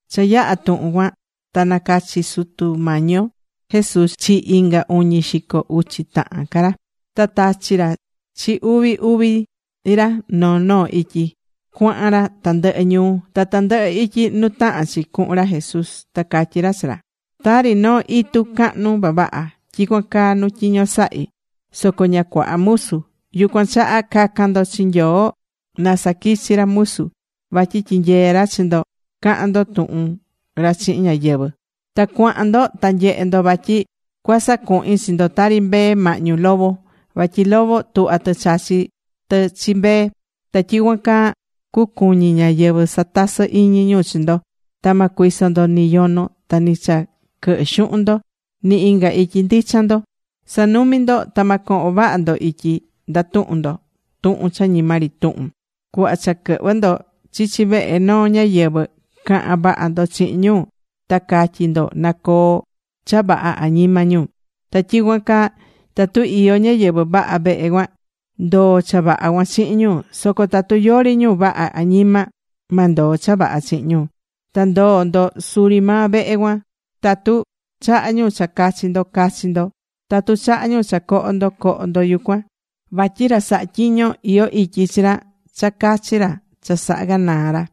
Cha yaha̱ tuhun cuan ta nacachi̱ Sutu Mañi yo Jesús chi inga uñi xico uchi tahan ca ra. Ta tachi̱ ra chi uvi uvi ra noo noo ityi cuahan ra tandɨhɨ ñuu ta tandɨhɨ ityi nu tahán chi cuhun ra Jesús. Ta catyí ra chi ra: ―Tari noo itu cahnu vavaha, tyicuan caa nu tyiño sahí. Soco ña cuaha musu. Yucuan chaha ca̱can ndo chi Nyoo na saquichi ca ra musu. Vatyi tyinyee ra chi ndo cahan ndo tuhun ra chihin ñáyɨvɨ. Ta cua̱han ndo ta nye̱he ndo vatyi cua sacuhin chi ndo tari mbee mahñu lobo. Vatyi lobo tuhvá tɨ chachí tɨ chi mbee. Ta tyicuan caa cucuñi ñáyɨvɨ satasɨ iñi ñu chi ndo. Ta ma cuiso ndo ni yono ta ni cha quɨhɨ xuhun ndo, ni inga ityi ndichan ndo. Sa̱numi ndo. Ta ma cohon vaha ndo ityi ndatuhun ndo tuhun cha ñima ri tuhun. Cuhva cha quɨhvɨ ndo chichi vehe noo ñáyɨvɨ, ca̱han vaha ndo chihin ñu. Ta ca̱tyi ndo, na coo cha vaha añima ñu. Ta tyicuan caa tatu iyó ñáyɨvɨ vaha vehe cuan, ndoo cha vaha cuan chihin ñu. Soco tatu yori ñu vaha añima, ma ndoo cha vaha chihin ñu. Ta ndo̱o ndo suri maa vehe cuan. Tatu chaha ñu cha cachi ndo, ca̱chi ndo. Tatu chaha ñu cha coho ndo, co̱ho ndo yucuan. Vatyi ra sahá tyiño, iyó ityi chi ra cha cachi ra cha sahá ganaa ra.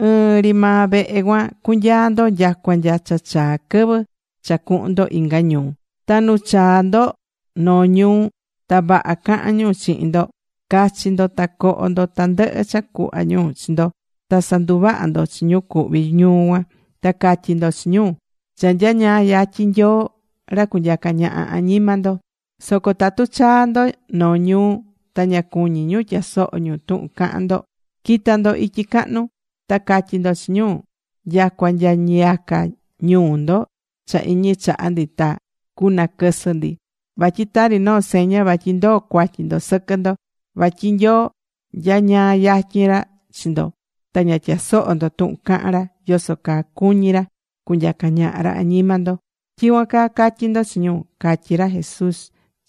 Ɨɨn ri maa vehe cuan cunyaa ndo nyacua nya cha chaa chi quɨvɨ cha cuhun ndo inga ñuu. Ta nu chaa ndo noo ñuu ta vaha cahan ñu chihin ndo, ca̱chi ndo ta co̱ho ndo tandɨhɨ cha cuhva ñu chi ndo. Ta sa̱nduvaha ndo chi ñu cuhví ñuu cuan. Ta ca̱tyi ndo chi ñu: “Cha nyañaa yatyin Nyoo ra cunyaca ñaha añima ndo.” Soco tatu chaa ndo noo ñuu ta ña cuñí ñu tyasoho ñu tuhun cahan ndo, qui̱ta ndo ityi cahnu. Ta ca̱tyi ndo chi ñu: “Nyacua nya ñiyaca ñuu ndo cha iñi chaha ndi, ta cunaquɨsɨ ndi. Vatyi tari noo seña vatyi ndoo cuatyi ndo sɨquɨ ndo. Vatyi Nyoo nyañaa yatyin ra chi ndo ta ña tyasoho̱ ndo tuhun cahán ra yoso caa cuñí ra cunyaca ñaha ra añima ndo.” Tyicuan caa ca̱tyi ndo chi ñu ―catyí ra Jesús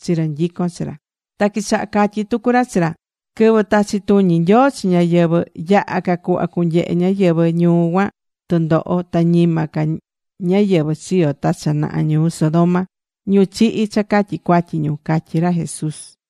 chi ra nyicón chi ra. Ta quichaha catyí tucu ra chi ra: ―Quɨvɨ tachi tuñi Nyoo chi ñáyɨvɨ, yaha ca cuhva cunyehe ñáyɨvɨ ñuu cuan tundoho, ta ñima ca ñáyɨvɨ chiyo̱ ta cha naha ñuu Sodoma, ñu chihi̱ cha catyi cuatyi ñu ―catyí ra Jesús.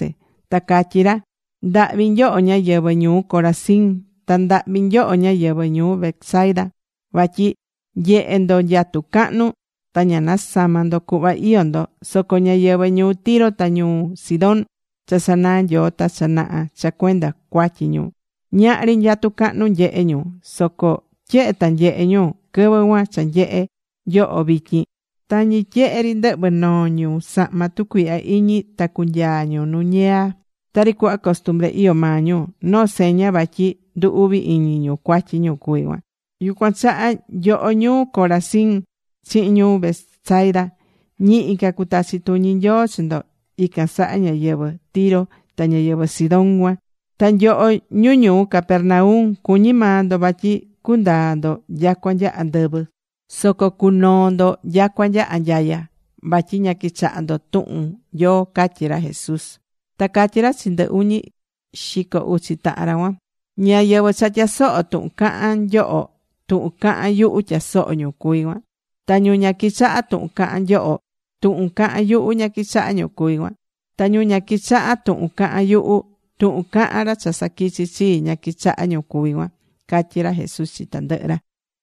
Ta catyí ra: ―¡Ndahvi nyoho, ñáyɨvɨ ñuu Corazín! Ta ¡ndahvi nyoho, ñáyɨvɨ ñuu Betsaida! Vatyi nyehé ndo nyatu cahnu, ta ña nasamá ndo cuhva iyó ndo. Soco ñáyɨvɨ ñuu Tiro ta ñuu Sidón cha sanaa̱ Nyoo ta cha naha cha cuenda cuatyi ñu, ñahri nyatu cahnu nyehe̱ ñu. Soco tyehe ta nyehe̱ ñu quɨvɨ cuan cha nyehé nyoho vityin, tañi tyehe ri ndɨhvɨ noo ñu sahma tucuihya iñi ta cunyaa ñu nu ñiyaa. Tari cuhva costumbre iyó maa ñu, noo seña vatyi ndu uvi iñi ñu cuatyi ñu cuví cuan. Yucuan chaha, nyoho ñuu Corazín chihin ñuu Betsaida, ñihi ca cutachi tuñi Nyoo chi ndo ican saha ñáyɨvɨ Tiro ta ñáyɨvɨ Sidón cuan. Ta nyoho ñu ñuu Capernaum, cuñí maa ndo vatyi cundaa ndo nyacua nya andɨvɨ. Soco cunoo ndo nyacua nya anyaya, vatyi ña quichahá ndo tuhun Nyoo ―catyí ra Jesús. Ta catyí ra chi ndɨ uñi xico uchi tahan ra cuan: ―Ñáyɨvɨ cha tyasohó tuhun cahán nyoho, tuhun cahán yuhu tyasohó ñu cuví cuan. Ta ñu ña quichahá tuhun cahán nyoho, tuhun cahán yuhu ña quichahá ñu cuví cuan. Ta ñu ña quichaha tuhun cahán yuhu, tuhun cahán ra cha saquichi̱ chii, ña quichahá ñu cuví cuan ―catyí ra Jesús chi tandɨhɨ ra.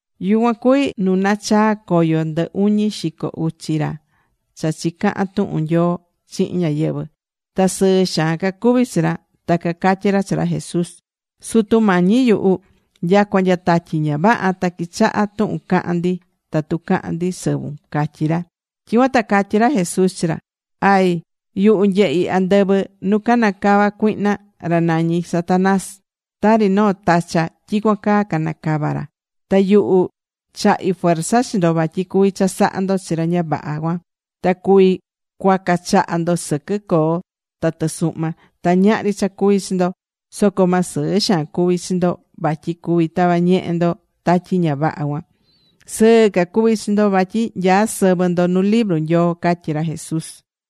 Yucuan cuví nu nachaa̱ coyo ndɨ uñi xico uchi ra cha chicaha̱n tuhun Nyoo chihin ñáyɨvɨ. Ta sɨɨ xaan cacuví chi ra. Ta cacatyí ra chi ra Jesús: ―Sutu Mañi yuhu, nyacua nya tatyi ña vaha ta quichahá tuhun cahán ndi tatu cahán ndi sɨvun ―catyí ra. Tyicuan ta catyí ra Jesús chi ra: ―Ay, yuhu nyehi̱ andɨvɨ nu cana̱ cava cuihna, ra nañí Satanás. Tari noo tacha, tyicuan caa cana̱ cava ra. Ta yuhu, chahi̱ fuerza chi ndo vatyi cuví chasaha ndo chi ra ña vaha cuan. Ta cuví cuaca chaha ndo sɨquɨ coo ta tɨsuhma, ta ñahri cha cuvi chi ndo. Soco ma sɨɨ xaan cuvi chi ndo vatyi cuví tava ñehe ndo tatyi ña vaha cuan. Sɨɨ ca cu̱vi chi ndo vatyi nyaá sɨvɨ ndo nu libru Nyoo ―catyí ra Jesús.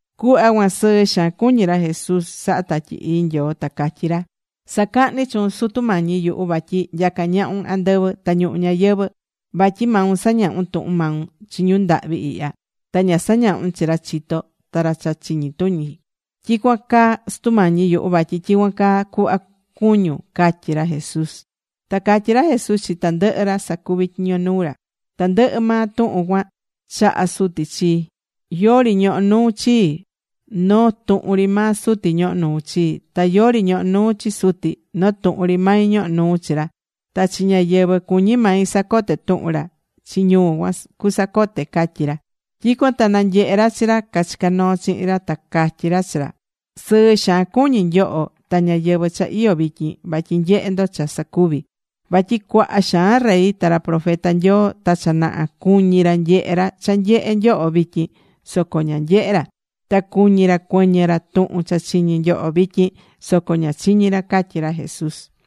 Cuhva cuan sɨɨ xaan cuñí ra Jesús sahá Tatyi Ii Nyoo, ta catyí ra: ―Sacahní chuun, Sutu Mañi yuhu, vatyi nyacá ñahun andɨvɨ ta ñuhu ñayɨvɨ̱. Vatyi maun sañahún tuhun maun chi ñu ndahvi ihya. Ta ña sañahún chi ra chitó ta ra cha chiñi tuñi. Tyicuan caa Sutu Mañi yuhu vatyi tyicuan caa cuhva cuñún ―catyí ra Jesús. Ta catyí ra Jesús chi tandɨhɨ ra sacuví tyiño nuu ra: ―Tandɨhɨ maa tuhun cuan chaha̱ Suti chii. Yori ñohó nuu chii, noo tuhun ri maa Suti ñohó nuu chii. Ta yori ñohó nuu chi Suti, noo tuhun ri mai ñohó nui chi ra. Ta chi ñáyɨvɨ cuñí mai sacote tuhun ra, chi ñu cuan cusacote ―catyí ra. Tyicuan ta nanyehe̱ ra chi ra cachicá noo chihin ra. Ta catyi ra chi ra: ―Sɨɨ xaan cuñí nyoho ta ñáyɨvɨ cha iyó vityin vatyi nyehé ndo cha sacuví. Vatyi cuaha xaan rey ta ra profeta Nyoo ta cha naha cuñi̱ ra nyehe ra cha nyehé nyoho vityin. Soco ña nyehe̱ ra. Ta cuñí ra cuɨñɨ ra tuhun cha chiñí nyoho vityin. Soco ña chiñi̱ ra ―catyí ra Jesús.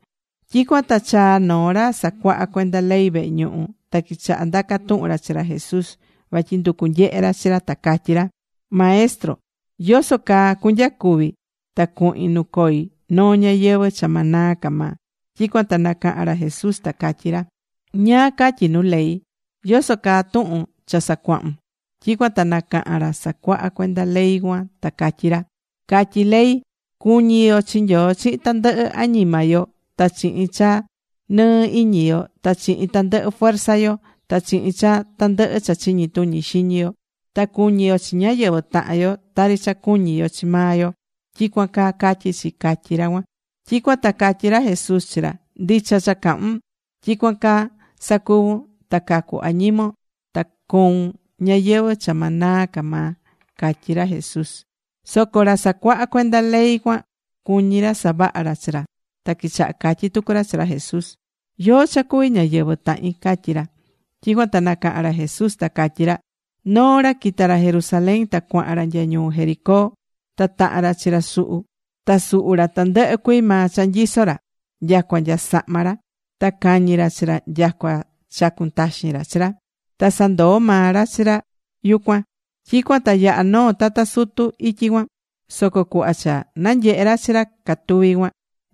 Tyicuan ta chaa̱ noo ra sacuahá cuenda ley vehe ñuhu. Ta quichaha ndaca tuhun ra chi ra Jesús, Vatyi nducu nyehe ra chi ra. Ta catyí ra: ―Maestro, ¿yoso caa cunyacuvi ta cuhin nu coi noo ñayɨvɨ̱ cha ma naa ca maa? Tyicuan ta nacaha̱n ra Jesús, ta catyí ra: ―¿Ñáá catyí nu ley? ¿Yoso caa tuhun cha sacuahún? Tyicuan ta nacaha̱n ra sacuaha cuenda ley cuan ta catyí ra: ―Catyí ley, cu̱ñi yo chi Nyoo chihin tandɨhɨ añima yo ta chihin cha nɨɨ iñi yo, ta chihin tandɨhɨ fuerza yo, ta chihin cha tandɨhɨ cha chiñi tuñi xiñi yo. Ta cu̱ñi yo chi ñáyɨvɨ tahan yo tari cha cuñí yo chi maa yo. Tyicuan caa catyí chi ―catyí ra cuan. Tyicuan ta catyí ra Jesús chi ra: ―Ndicha cha cahún. Tyicuan caa sa̱cuvun ta cacu añimon ta coun ñayɨvɨ̱ cha ma naa ca maa ―catyí ra Jesús. Soco ra sacuaha cuenda ley cuan cuñí ra savaha ra chi ra, ta quichaha catyi tucu ra chi ra Jesús: ―¿Yóó cha cuví ñáyɨvɨ tahin? ―catyí ra. Tyicuan ta nacaha̱n ra Jesús, ta catyí ra: ―Noo ra quita̱ ra Jerusalén ta cuahan ra nya ñuu Jericó. Ta taha̱n ra chi ra suhu. Ta suhu̱ ra tandɨhɨ cuii maa cha nyiso̱ ra, nyacua nya sahma ra. Ta cañi̱ ra chi ra nyacua chacu̱n taxin ra chi ra. Ta sandoo̱ maa ra chi ra yucuan. Tyicuan ta yaha̱ noo tata sutu ityi cuan. Soco cuhva cha nanyehe̱ ra chi ra catuví cuan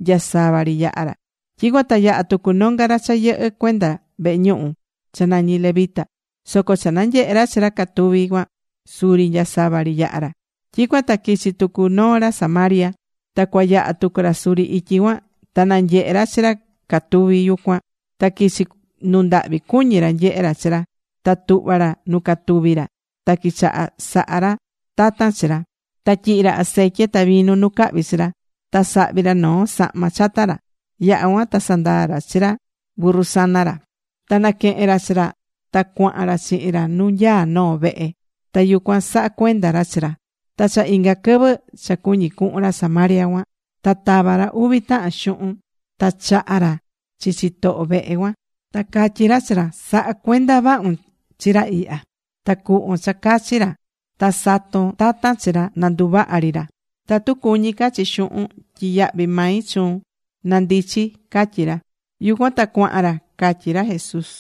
nya sava ri yaha̱ ra. Tyicuan ta yaha̱ tucu nonga ra cha yɨhɨ́ cuenda vehe ñuhu, cha nañí levita. Soco cha nanyehe̱ ra chi ra catuví cuan suri nya sava ri yaha̱ ra. Tyicuan ta quichi tucu noo ra Samaria. Ta cua yaha tucu ra suri ityi cuan. Ta nanyehe̱ ra chi ra catuví yucuan, ta quichi nundahvi cuñi ra nyehe ra chi ra. Ta tuhva̱ ra nu catuví ra, ta quichaha saha ra tatan chi ra. Ta tyihi̱ ra aceitye ta vinu nu cahvi chi ra. Ta sahvi̱ ra noo sahma chata ra. Yaha̱ cuan ta sandaa ra chi ra burru sana ra, ta naquehe̱n ra chi ra, ta cuahan ra chihin ra nu nyaá noo vehe. Ta yucuan saha̱ cuenda ra chi ra. Ta cha inga quɨvɨ cha cuñí cuhun ra Samaria cuan. Ta tava ra uvi tahan xuhun. Ta chaha̱ ra chi chitoho vehe cuan. Ta catyí ra chi ra: “Sa̱ha cuenda vahun chi ra ihya. Ta cu̱hvon cha cachi ra. Ta sa̱ton tatan chi ra na nduvaha ri ra. Tatu cuñí ca chi xuhun, tyiyahvi̱ mai chuun nandichi”, catyí ra. Yucuan ta cuahan ra ―catyí ra Jesús.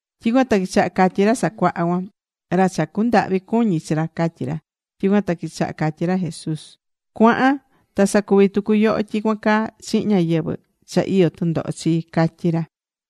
Tyicuan ta quichaha catyi ra sacuaha cuan: ―Ra cha cundahvi cuñi chi ra ―catyí ra. Tyicuan ta quichaha catyi ra Jesús: ―Cu̱ahan ta sa̱cuvi tucu yoho tyicuan caa chihin ñáyɨvɨ cha iyó tundoho chii ―catyí ra.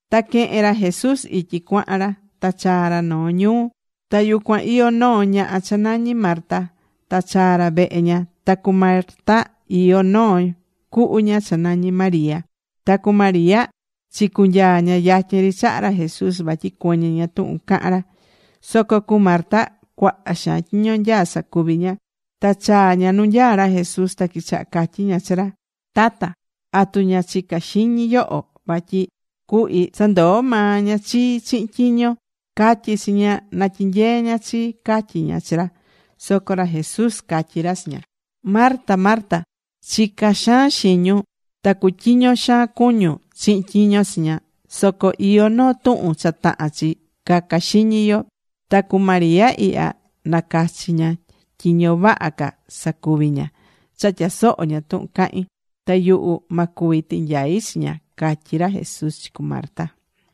Ta quehe̱n ra Jesús ityi cuahan ra. Ta chaa̱ ra noo ñuu. Ta yucuan iyó noo ñaha cha nañí Marta. Ta chaa̱ ra vehe ña. Ta cu Marta iyó noo cuhu ña cha nañí María. Ta cu María chicunyaa̱ ña yatyin ri chaha ra Jesús, vatyi cuɨñɨ ña tuhun cahán ra. Soco cu Marta cuaha xaan tyiño nyaá sacuvi ña. Ta chaa̱ ña nu nyaá ra Jesús, ta quichaha catyí ña chi ra: ―Tata. ¿Atu ña chicá xiñi yoho vatyi cuhi sandoó maa ña chii chihin tyiño? Ca̱tyi chi ña na tyinyee ña chii ―catyí ña chi ra. Soco ra Jesús catyí ra chi ña: ―Marta, Marta, chicá xaan xiñun ta cutyiño xaan cuñún chihin tyiño chiña. Soco iyó noo tuhun cha tahán chi caca xiñi yo. Ta cu María ihya nacachi̱ ña tyiño vaha ca sacuvi ña cha tyasohó ña tuhun cahín. Ta yuhu ma cuvi tinyai chi ña ―catyí ra Jesús chi cu Marta.